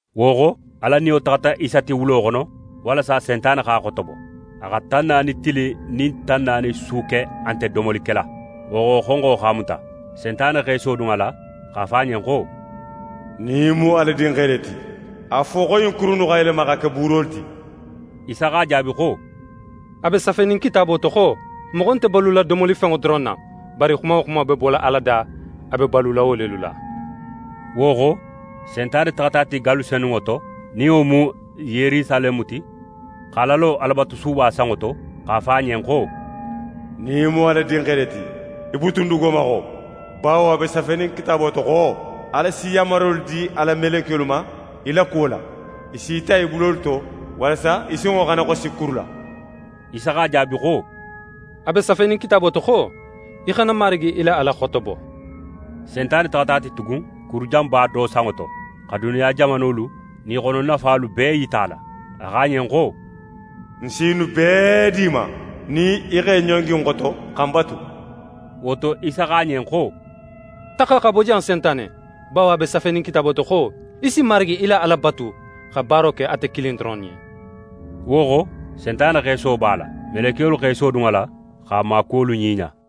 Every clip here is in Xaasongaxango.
Wo xo, Ala Niyo taxata Isa ti wulo xono, walasa Sentane x'a xotobo. A xa tan naani tili nin tan naani su ke a nte domoli kela. Wo xo, xonxo x'a muta. Sentane x'é sodun a la x'a fo a ɲen xo: «Nin í mu Ala Dinxe le ti, a fo xo ɲin kuru innu xa yelema xa ke buurolu ti.» Isa x'a jaabi xo: «A be safenin Kitaabo to xo: “Moxo nte balula domolifenŋo doron na, bari xuma wo xuma be bola Ala da, a be balula wo lelu la.”» Wo xo, Sentane taxata a ti gallu senunŋo to, nin wo mu Yerusaleme ti, x'a lalo Alabatusuba sanŋo to, x'a fo a ɲen xo: «Nin í mu Ala Dinxe le ti, í butun dugo ma xo; bawo a be safenin Kitaabo to xo: “Ala si yanmarolu di a la melekiyolu ma í la kuwo la, i s'í ta i bulolu to, walasa í sinŋo xana xosi kuru la.”» Isa x'a jaabi xo: «A be safenin Kitaabo to xo: “Í xana Marigi í la Ala xotobo.”» Sentane taxata a ti tugun kurujanba do sanŋo to, xa duniya jamanolu nin i xono nafalu bee yita a la. A xo a ɲen xo: «Ń si ɲinnu bee di í ma, nin í x'é ɲongi ń xoto, xa ń batu.» Wo to, Isa xo a ɲen xo: «Taxa xa bo jan, Sentane! Bawo a be safenin Kitaabo to xo: “Í si Marigi í la Ala batu, xa baaro ke ate kilin doron ɲen.”» Wo xo, Sentane x'é soobo a la. Melekiyolu x'e sodun a la, x'a maakuwolu ɲiɲa.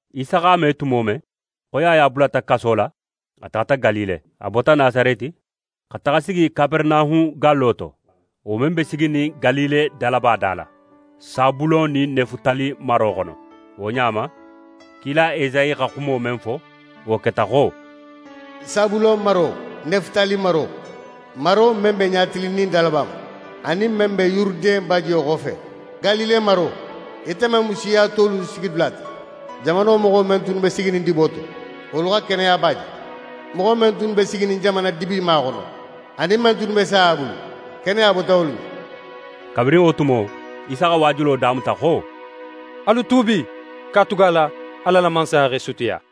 Isa x'a me tumo men xo Yaya bulata kaso la, a taxata Galile. A bota Nasareti xa taxa sigi Kaperenahun gallo to, wo men be siginin Galile dalaba da la, Sabulon nin Nefutali maro xono. Wo ɲa ma, kila Esayi xa xumo men fo, wo keta xo: «Sabulon maro, Nefutali maro, maro men be ɲatilinnin dalaba ma, anin men be Yuruden bajiyo xofe, Galile maro, ite men mu siya tolu sigidula ti! Jamano moxo men tunnu be siginin dibo to, wolu xa keneyaba je! Moxo men tunnu be siginin jamana dibima xono, anin men tunnu be saya bulu, keneya bota wolu ɲen.» Kabirin wo tumo, Isa xa waajulo damuta xo: «Alu tuubi, katugala Ala la Mansaya x'é sutiya!»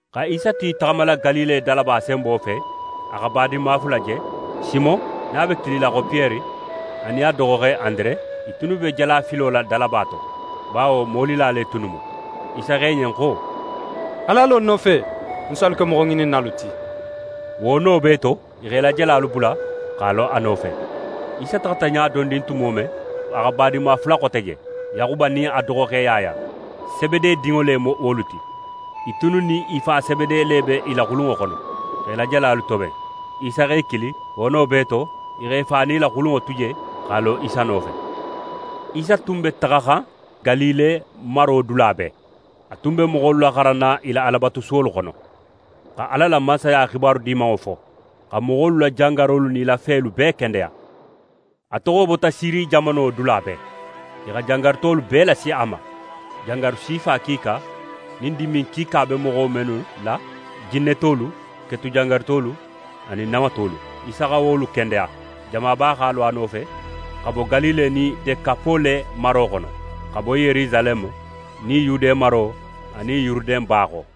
Xa Isa tu í taxamala Galile dalaba senbo fe, a xa badinma fula je; Simon, nin a be kilila xo Piyere, anin a doxoxe Andere. I tunnu be jalafilo la dalaba to, bawo molila le tunnu mu. Isa xo i ɲen xo: «Alu a lo ń nofe, ń si alu ke moxoŋininnalu ti.» Wo no bee to, i x'e la jalalu bula, x'a lo a nofe. Isa taxata ɲa dondin tumo men, a xa badinma fula xote je; Yaxuba nin a doxoxe Yaya. Sebede dinŋo le mu wolu ti. I tunnu nin i fa Sebede le be i la xulunŋo xono, x'e la jalalu toben. Isa x'e kili. Wo no bee to, i x'e fa nin i la xulunŋo tu je, x'a lo Isa nofe. Isa tun be taxaxan Galile maro dula bee. A tun be moxolu laxaranna i la Alabatusuwolu xono, xa Ala la Mansaya xibaru Dimanŋo fo, xa moxolu la jangarolu nin i la felu bee kendeya. A toxo bota Siri jamano dula bee, i xa jangarutolu bee lasi a ma: Jangaru sifa kiika nin dimin kiika be moxo mennu la, jinnetolu, ketujangarutolu anin namatolu. Isa xa wolu kendeya. Jamaba x'a lo a nofe, xa bo Galile nin Dekapole maro xono, xa bo Yerusaleme nin Yude maro anin Yuruden ba xo.